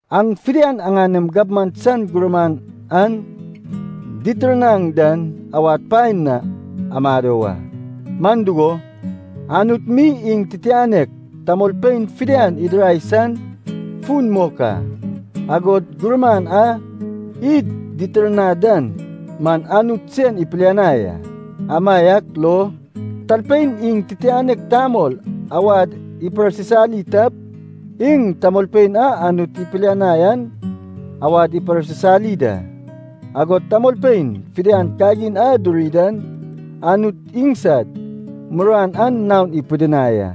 Aŋ fidian aŋanem gabman san gurman aŋ ditirnaŋ dan awad paen na amado wa. Man dugo, Anut mi iŋ titianek tamolpein fidian idirai san fun mok a, agod gurman a id ditirnad dan man Anut sen ipilianai a. Amaiak lo, talpein iŋ titianek tamol awad iparsisali tap, iŋ tamolpein a Anut ipilianai an awad iparsisali da. Agod tamolpein fidian kagin a duri dan Anut iŋsad muruan an naon ipidinai a.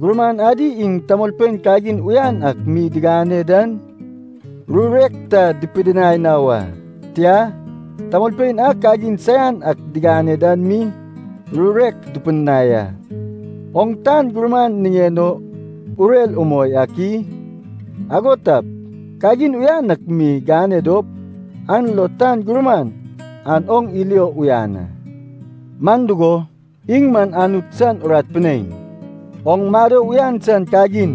Gurman adi iŋ tamolpein kagin uyan ak mi digane dan rurek ta dupidinai na wa. Tia, tamolpein a kagin saian ak digane dan mi rurek dupidinai a. Oŋ tan gurman niŋen o urer umoi ak i? Ago tap, kagin uyan ak mi gane dop, an lo tan gurman an oŋ ilio uyan a. Man dugo, iŋ man Anut san urat pinein, oŋ mado uyan san kagin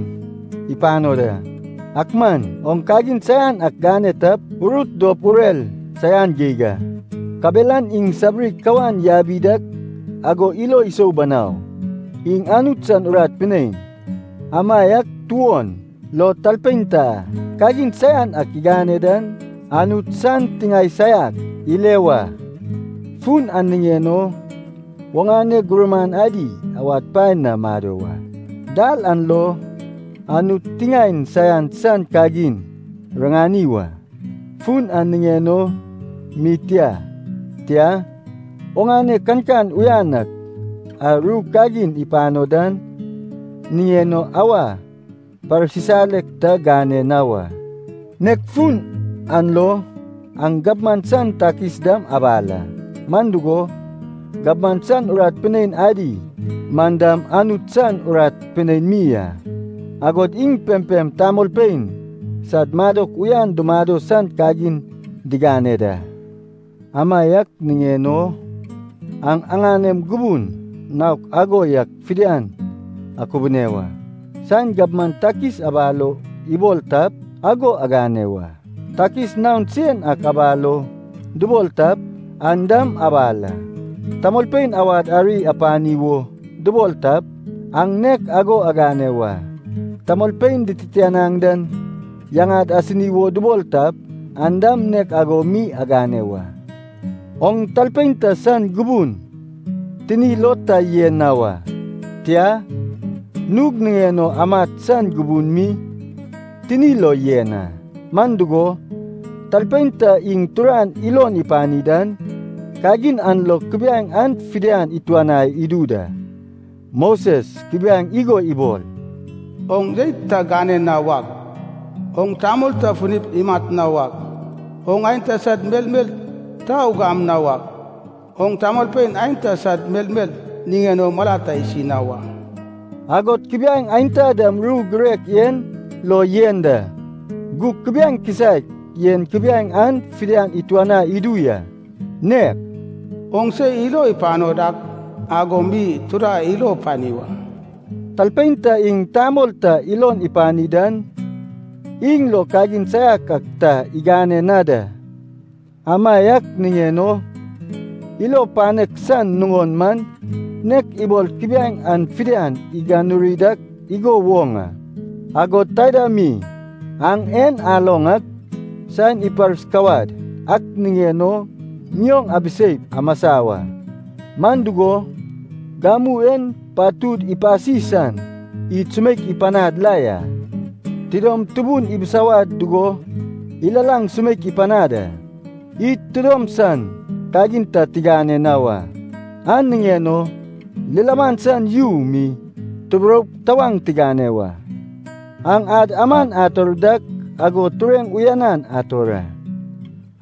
ipano da. Ak man oŋ kagin saian ak gane tap, urut dop urer saian geig a. Kabelan iŋ sabiri kawan yabi dak ago ilo isou banau. Iŋ Anut san urat pinein, amaiak tuon lo talpein ta kagin saian ak igane dan, Anut san tiŋae saiak ile wa. Fun an niŋen o, oŋane gurman adi awad paen na mado wa. Dal an lo Anut tiŋaen saian san kagin riŋani wa. Fun an niŋen o mi tia, tia, oŋane kankan uyan ak a ru kagin ipano dan niŋen o awa parsisalek ta gane na wa. Nek fun an lo aŋ gabman san takis dam abal a. Man dugo, gabman san urat pinein adi man dam Anut san urat pinein mi a, agod iŋ pempem tamolpein sad madok uyan dumado san kagin digane da. Amaiak niŋen o aŋ aŋanem gubun naok ago yak fidian akubune wa. Saen gabman takis abal o ibol tap, ago agane wa. Takis naon sen ak abal o dubol tap, an dam abal a. Tamolpein awad ari apani wo dubol tap, aŋ nek ago agane wa. Tamolpein dititianaŋ dan yaŋad asini wo dubol tap, an dam nek ago mi agane wa. Oŋ talpein ta san gubun tini lo ta yen na wa, tia, nug niŋen o amat san gubun mi tini lo yen a. Man dugo, talpein ta iŋ turan ilon ipani dan, kagin an lo kubiaeŋ an fidian ituanai idu da. Moses kubiaeŋ igo ibol, “Oŋ jeit ta gane na wak, oŋ tamol ta funip imat na wak, oŋ aenta sad melmel ta ugam na wak, oŋ tamolpein aenta sad melmel niŋen o mala ta isi na wa,” agod kubiaeŋ aenta dam ru girek en lo yen da. Gug kubiaeŋ kisaek en kubiaeŋ an fidian ituanai idu ya, nek “Oŋ se ilo ipano dak ago mi tura ilo pani wa.” Talpein ta iŋ tamol ta ilon ipani dan, iŋ lo kagin saian ak ta igane na da. Amaiak niŋen o ilo panek san nuŋon man nek ibol kubiaeŋ an fidian iganuri dak igo woŋ a. Agod taida mi aŋ en aloŋ ak, saen iparsikawad ak niŋen o ŋioŋ abiseip amasa wa. Man dugo, gamu en patud ipasi san id sumeik ipanad la ya. Tidom tubun ibisawad dugo ilalaŋ sumeik ipanad a. Id tidom san kagin ta tigane na wa. An niŋen o lilaman san yu mi tuburoup tawaŋ tigane wa. Aŋ ad aman ator dak ago tureŋ uyanan ator a.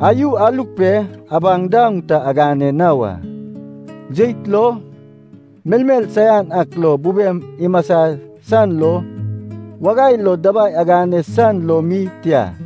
Ayu aluk pe abaŋ daoŋ ta agane na wa. Jeit lo, melmel saian ak lo bubem imasa san lo, wagai lo dabai agane san lo mi tia.